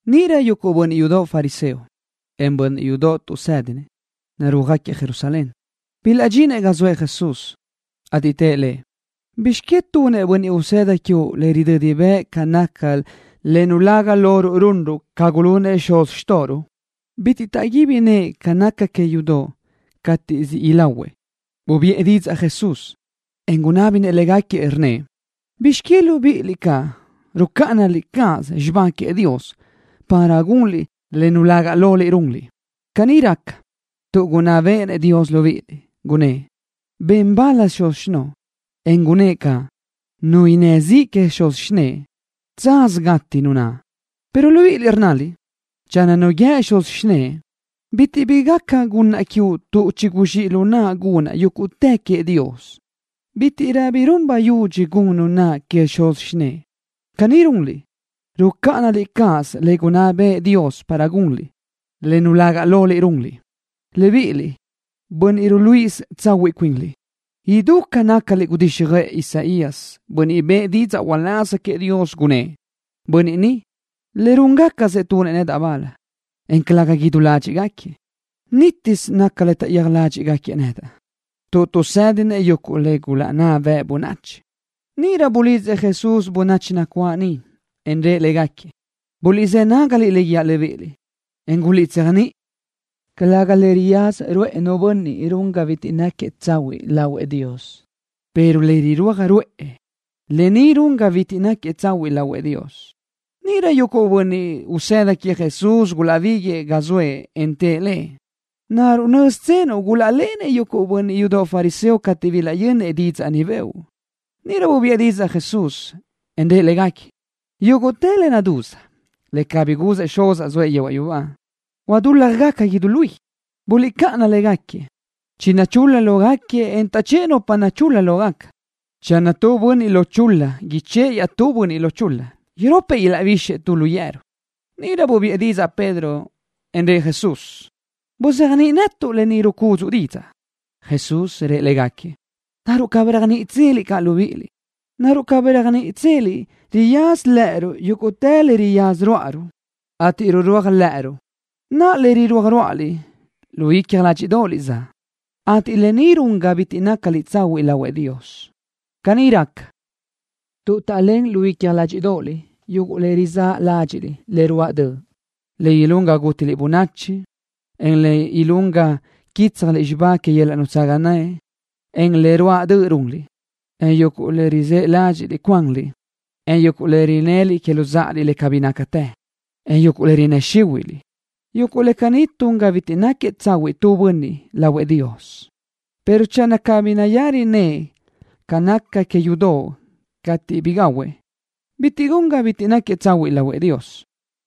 Níʼirö yuguʼ bönniʼ yudoʼ fariseo, en bönniʼ yudoʼ tuʼsédinëʼ, narúajgaquiëʼ Jerusalén, bilaʼdxinëʼ ga zoëʼ Jesús, ateʼ tëʼ Lëʼ: —¿Bizx que tunëʼ bönniʼ usëda quiuʼ le ridödi bëʼ ca naca le nulaga loruʼ runruʼ ca gulunëʼ xuz xtóʼoruʼ? Bitiʼ taʼguíbi nëʼë ca naca que yudoʼ cateʼ siʼ ilahuëʼ. Bubiʼë didzaʼ Jesús, en gunábinëʼ légaquiëʼ, rnnëʼ: —¿Bizx que libíʼiliʼ caʼ rucáʼanaliʼ cáʼasö xibá queëʼ Dios para gunliʼ le nulaga loliʼ runliʼ? Caní raca, tuʼ gunná béʼenëʼ Dios libíʼiliʼ, gunnë́ʼ: “Ben bal xuz xinoʼo”, en gunnë́ʼ caʼ: “Nu innë́ ziʼ que xuz xinëʼe, tsaz gati nu naʼ.” Pero libíʼiliʼ rnnaliʼ: “Channö nu guíë xuz xinëʼe: Bitiʼ bi gaca gunnaʼ quiuʼ tuʼ chiguzxíʼ lu naʼa gunnaʼ yúguʼtë queëʼ Dios, bítiʼrö bi run bayudxi gun nu naʼ que xuz xinëʼe.” Caní runliʼ, rucáʼanaliʼ cáʼasö le gunná bëʼë Dios, para gunliʼ le nulaga loliʼ runliʼ. Libíʼiliʼ, bönniʼ ruluíʼisö tsahuiʼ cuinliʼ, idú ca nácaliʼ gudíxjöʼë Isaías, bönniʼ bëʼë didzaʼ uláz queëʼ Dios, gunnë́ʼ: Bönniʼ ni, len rúʼagacsëʼ tunëʼ nedaʼ bal, en calëga idú ládxiʼgaquiëʼ. Nítisö naca le taʼyéaj ládxiʼgaquiëʼ nedaʼ, tuʼ tuʼsédinëʼ yuguʼ le gulaʼnná bëʼ bönachi. Níʼirö bulidzëʼ Jesús bönachi nacuáʼ niʼ, en rëʼ léguequi: —Buliʼzë́ nágaliʼ le guíaʼ libíʼiliʼ, en guliʼtséajniʼi. Calëga le riyaza ruʼë nu bönniʼ run ga bitiʼ náquiëʼ tsahuiʼ lahuëʼ Dios, pero le rirúaj ruʼë, lë ni run ga bitiʼ náquiëʼ tsahuiʼ lahuëʼ Dios. Níʼirö yuguʼ bönniʼ usëda queëʼ Jesús gulaʼbíguiʼë ga zoëʼ, en tëʼ Lëʼ: —¿Naruʼ nö́ztsenuʼ gulaʼlenëʼ yuguʼ bönniʼ yudoʼ fariseo cateʼ bilaʼyönnëʼ didzaʼ ni bëʼu? Níʼirö bubiʼë didzaʼ Jesús, en rëʼ légaquiëʼ: —Yúguʼtë le nadúz, le cabí guzëʼ Xuzaʼ zoëʼ yehuaʼ yubá, huadúljagaca idú luí. Buliʼcáʼana légaquiëʼ. Chinachúl-la lógaquiëʼ, en taʼchë́ʼë nupa nachul-la lógaca. Channö tu bönniʼ lo chul-la ichë́ʼë iaʼtúëʼ bönniʼ lo chul-la, iropëʼ ilaʼbixëʼ tu lu yeru. Níʼirö bubiʼë didzaʼ Pedro, en rëʼ Jesús: —Buzéajniʼi netuʼ lë ni rucúdzuʼu didzaʼ. Jesús rëʼ légaquiëʼ: —¿Naruʼ cabí réajniʼitseliʼ caʼ libíʼiliʼ? ¿Naruʼ cabí réajniʼitseliʼ riyaza lë́ʼëruʼ yúguʼtë le riyaza ruáʼaruʼ, ateʼ rurúaj lë́ʼëruʼ? Naʼa, le rirúaj rúaʼaliʼ, lu icja ládxiʼdoʼoliʼ zaʼ, ateʼ lë ni run ga bitiʼ nácaliʼ tsahuiʼ lahuëʼ Dios. Caní raca, tuʼ taʼlén lu icja ládxiʼdoʼoliʼ yuguʼ le rizáʼ ládxiʼliʼ le ruáʼ döʼ, le ilún ga gútiliʼ bönachi, en le ilún ga quítsjaliʼ xibá que yöl-laʼ nutsaga naʼ, en le ruáʼ döʼ runliʼ, en yuguʼ le rizë́ ládxiʼliʼ cuanliʼ, en yuguʼ le rinnëliʼ que luzáʼaliʼ le cabí nácate, en yuguʼ le rinnë́ xíhuiʼliʼ. Yuguʼ le caní tun ga bitiʼ náquiëʼ tu bönniʼ tsahuiʼ lahuëʼ Dios, pero channö cabí nayari nëʼë ca naca que yudoʼ cateʼ bi gahuëʼ, bitiʼ gun ga bitiʼ náquiëʼ tsahuiʼ lahuëʼ Dios.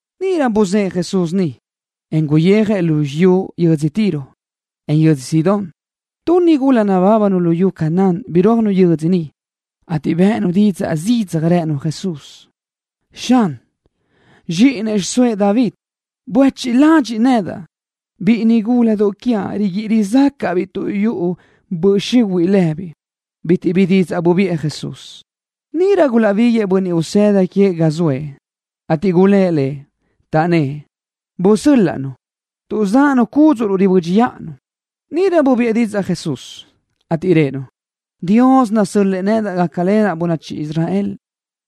Níʼirö buzë́ʼë Jesús niʼ, en guyéajëʼ lu xiyú yödzö Tiro, en yödzö Sidón. Tu nigula nabábanu luyú Canaán birúajnu yödzö niʼ, ateʼ bë́ʼënu zidzaj didzaʼ, rënu Jesús: —Xan, zxíʼini xiʼsóëʼ David, buéchiʼ ladxiʼ nedaʼ. Biʼi nigúladoʼ quiaʼ riguíʼi rizácaʼdaʼabiʼ tuʼ yuʼu böʼ xihuiʼ lëbiʼ. Bitiʼ bi didzaʼ bubiʼë Jesús. Níʼirö gulaʼbíguiʼë bönniʼ usëda queëʼ ga zoëʼ, ateʼ gulë́ʼ Lëʼ, taʼnnë́ʼ: —Busö́l-laʼ-nu, tuʼ záʼanu cúdzuʼruʼ ribö́dxiʼanu. Níʼirö bubiʼë didzaʼ Jesús, ateʼ rëʼë-nu: —Dios nasö́l-lëʼë nedaʼ gácalenaʼ bönachi Israel,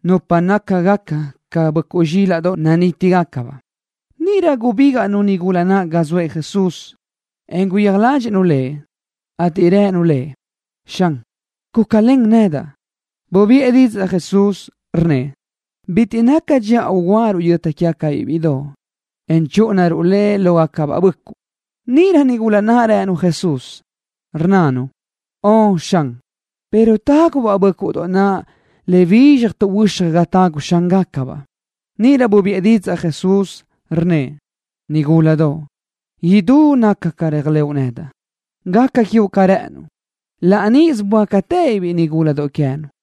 nupa nácagaca ca böʼcuʼ zxílaʼdoʼ nanítigacabaʼ. Níʼirö gubígaʼnu nigula naʼ ga zoëʼ Jesús, en guyéaj ládxiʼnu Lëʼ, ateʼ rënu Lëʼ: —Xan, gúcalen nedaʼ. Bubiʼë didzaʼ Jesús, rnnëʼ: —Bitiʼ naca dxiʼa ugúaruʼ yöta quégacabiʼ bíʼidoʼ, en chúʼunaruʼ le lógacabaʼ bö́ʼcuʼdoʼ. Níʼirö nigula naʼ rënu Jesús, rnnanu: —Ön, Xan, pero tágubaʼ bö́ʼcuʼdoʼ naʼ le bizxaj tuʼhuö́xaj ga tagu xángacabaʼ. Níʼirö bubiʼë didzaʼ Jesús, rnnëʼ: —Nigúladoʼ. Idú naca ca réajlëʼu nedaʼ. Gaca quiuʼ ca rë́ʼënnuʼ. Laʼ níʼisö böácatëbiʼ biʼi nigúladoʼ queë́nu.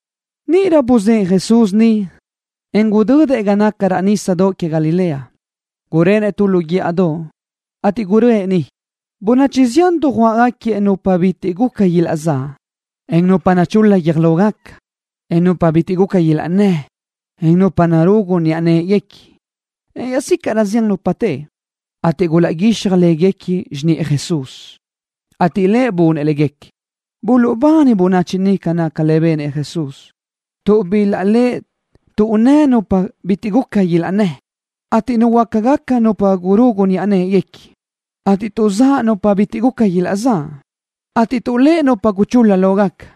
Níʼirö buzë́ʼë Jesús niʼ, en gudödëʼ ga naca raʼ nísadoʼ que Galilea. Gurenëʼ tu lu guíʼadoʼ, ateʼ guröʼë niʼ. Bönachi zián dujuáʼgaquiëʼ nupa bitiʼ guca ilaʼzáʼ, en nupa nachul-la guiö́j lógaca, en nupa bitiʼ guca ilaʼnnë́, en nupa narugu niʼa në́ʼeguequi, en iaʼzícaʼrö zián nupa teʼe, ateʼ gulaʼguíxaj léguequi xiniʼë Jesús, ateʼ Lëʼ bunëʼ léguequi. Buluʼbani bönachi niʼ ca naca le benëʼ Jesús, tuʼ bilaʼléʼe tuʼnnë́ nupa bitiʼ guca ilaʼnnë́, ateʼ nuhuöácagaca nupa gurugu niʼa në́ʼeguequi, ateʼ tuʼzáʼ nupa bitiʼ guca ilaʼzáʼ, ateʼ tuʼléʼe nupa guchul-la lógaca.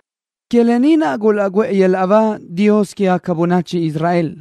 Que lë ni naʼ gulaʼguʼë yöl-laʼ ba Dios quégaca bönachi Israel.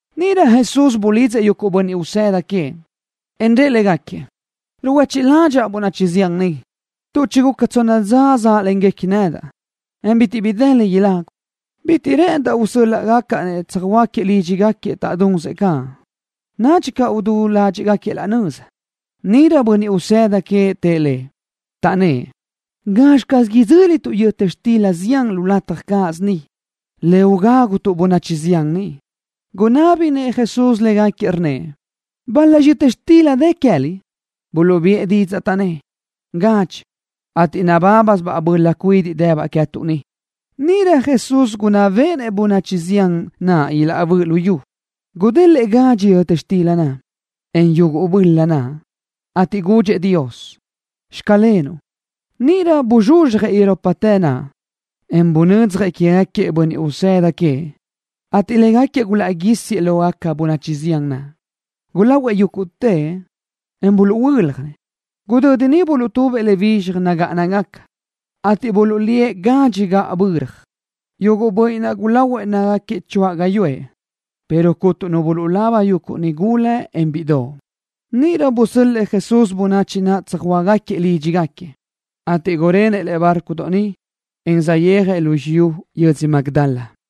Níʼirö Jesús bulidzëʼ yuguʼ bönniʼ usëda queëʼ, en rëʼ légaquiëʼ: —Ruhuechiʼ ládxaʼa bönachi zián ni, tuʼ chiguca tsonna dza záʼlenguequi nedaʼ, en bitiʼ bi dë le ilagu. Bitiʼ rë́ʼëndaʼ usö́l-laʼgacaʼ-nëʼ tsöjhuö́ajgaquiëʼ lídxigaquiëʼ taʼdunsëʼ caʼ, nadxi caʼ udú ládxiʼgaquiëʼ laʼ nöza. Níʼirö yuguʼ bönniʼ usëda queëʼ tëʼ Lëʼ, taʼnnë́ʼ: —¿Gazxi caz idzö́lituʼ yöta xtila zián lu lataj cáʼasö ni, le ugágutuʼ bönachi zián ni? Gunábinëʼ Jesús légaquiëʼ, rnnëʼ: —¿Bal-laxi yöta xtila dë queë́liʼ? Buluʼbiʼë didzaʼ, taʼnnë́ʼ: —Gadxi, ateʼ nabábasöbaʼ böla cuidiʼ dëbaʼ queë́tuʼ ni. Níʼirö Jesús gunná béʼenëʼ bönachi zián naʼ ilaʼbö́ʼ lu yu. Gudélëʼë gadxi yöta xtila naʼ, en yuguʼ böla naʼ, ateʼ gudxëʼ Dios: “Xclenuʼ.” Níʼirö buzxuzxjëʼ iroptë naʼ, en bunödzjëʼ quégaquiëʼ bönniʼ usëda queëʼ, ateʼ légaquiëʼ gulaʼguísiëʼ le lógaca bönachi zián naʼ. Gulahuëʼ yúguʼtëʼ, en buluʼhuö́ljanëʼ. Gudödi niʼ buluʼtubëʼ le bizxaj nagáʼanagaca, ateʼ buluʼlíëʼ gadxi gaʼböra. Yuguʼ bönniʼ naʼ gulahuëʼ nácagaquiëʼ choáʼ gáyuʼë, pero cuntu nu bulaba yuguʼ nigula, en bíʼidoʼ. Níʼirö busöl-lëʼë Jesús bönachi naʼ tsöjhuö́ajgaquiëʼ lídxigaquiëʼ, ateʼ gurenëʼ lëʼe bárcodoʼ niʼ, en saʼyéajëʼ lu xiyú yödzö Magdala.